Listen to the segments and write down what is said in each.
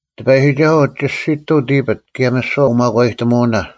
ᑎᐸᔨᒋᒐᓱᐤ, ᒋᔅᒋᑐᐤ ᑎᐱᑦ, ᑭᔭ ᒥᓯᐛ ᐅᒪᒂᔨᑎᒧᐅᓇ᙮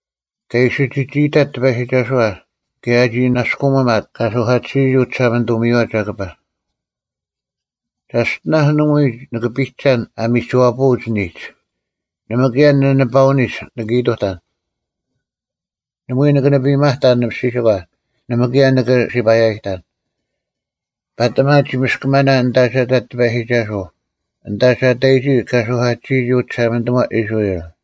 ᑲᒋ ᐃᓯ ᒋᒋ ᐃᑕᑦ ᑎᐸᔨᒋᒐᓱᐛ, ᑭᔭ ᐊᒋ ᓇᔅᑯᒥᒪᑦ ᑲ ᓱᐧᑲᑎᓯᔨᒋ ᐅᒋᓴᒪᓂᑐᒥᔪᐛ ᒐᑭᐸ: “ᒐᔅᑎᓇᔅ ᓇᒪᐎᔾ ᓂᑭ ᐱᒐᓐ ᐊ ᒥᒋᐛᐳᐅᒡ ᓂᒡ, ᓇᒪ ᑭᔭ ᓂᓂᐸᐅᓂᒡ ᓂᑭ ᐃᑐᑕᓐ; ᓇᒪᐎᔾ ᓂᑭ ᓂᐸᒪᑕᓐ ᓂᔅᒋᓯᒂ, ᓇᒪ ᑭᔭ ᓂᑭ ᓯᐸᔭᔨᑕᓐ; ᐸᑎᒪ ᒋ ᒥᔅᑭᒪᓇ ᐊᓐᑕ ᒐ ᑕᑦ ᑎᐸᔨᒋᒐᓱᐤ, ᐊᓐᑕ ᒐ ᑕᔨᒋ ᑲ ᓱᐧᑲᑎᓯᔨᒋ ᐅᒋᓴᒪᓂᑐᒪ ᐃᔅᕋᐃᓪ᙮”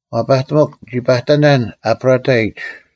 ᐛᐸᑎᒥᒄ, ᓂᒋ ᐸᑕᓇᓐ ᐊᑉᕋᑕᐃᒡ;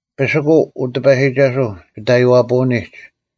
ᐱᓯᑯᐤ, ᐅᑎᐸᔨᒋᒐᓱᐤ, ᒋᑦ ᐊᔽᐳᐅᓂᒡ;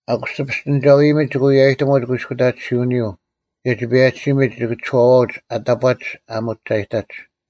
ᐊᑯᔅ ᒋᐱᔅᑎᓂᒐᐅ-ᐃᔨᒥᒡ ᒋᑭ ᐎᔭᑎᒧᒡ ᑯᐃᔅᑯᑕᑎᓯᐅᓂᔪᐤ; ᑭᔭ ᒋᐸᔭᒋᓯᒥᒡ ᒋᑭ ᒋᔄᐛᐅᒡ ᐊᑕᑈᒡ ᐊ ᒧᒋᒐᔨᑕᒡ᙮”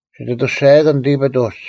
ᒋᑦ ᐊᑐᔅᒐᔭᑭᓐ ᑎᐱᑦ ᐅᒡ,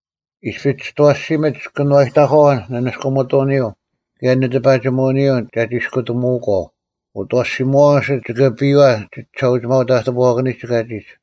ᐃᔅᐱᔅ ᒋᑦ ᐊᐛᓯᒥᓯᒡ ᑭᓄᐛᔨᑕᒂᐛ ᓂᓂᔅᑯᒥᑐᐅᓂᔪᐤ, ᑭᔭ ᓂᑎᐸᒋᒧᐅᓂᔪᐤ ᒐ ᒋᔅᑯᑎᒧᐅᒂᐤ; ᐅᑦ ᐊᐛᓯᒧᐛᐛ ᐊᓯᒡ ᒋᑭ ᐊᐱᔪᐛ ᒋᒋᓴᐅᒋᒪᐅ-ᑕᑎᐳᐛᑭᓂᒡ ᑲᒋᒡ᙮”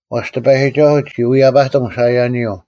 ᐛᔅ ᑎᐸᔨᒋᒐᓱᐤ ᒋ ᐅᐛᔭᐸᑎᒻ ᓴᐃᔭᓂᔪᐤ: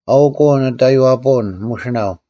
“ᐊᐅᒄ ᐅ ᓂᑦ ᐊᔽᐳᐅᓐ ᒧᓯᓇᐤ: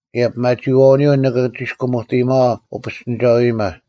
ᑭᔭ ᐱᒪᒋᐃᐛᐅᓂᔪᐤ ᓂᑭ ᒋᔅᑭᒧᑎᔨᒪᐛ ᐅᐱᔅᑎᓂᒐᐅ-ᐃᔨᒪ: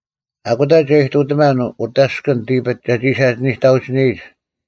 ᐊᑯᑕ ᒐ ᐃᑐᑎᒪᓐ ᐅᑦ ᐊᔅᑭᓐ ᑎᐱᑦ ᒐᒋ ᓴᒋᓂᑕᐅᒋᓂᔨᒡ: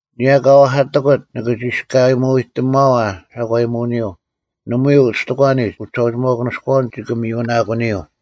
ᐊᓂᔭ ᑲ ᐛᐧᑲᑎᑯᑦ ᓂᑭ ᒋᔅᑲᒧᑎᔨᒪᐛ ᓴᒂᔨᒧᐅᓂᔪᐤ; ᒪᒃ ᐎᔾ ᐅᔅᑎᒂᓂᒡ ᐅᒋᓴᐅᒋᒪᐅᑯᓂᔎᐅᓐ ᒋᑭ ᒥᔪᓇᑯᓂᔪᐤ᙮”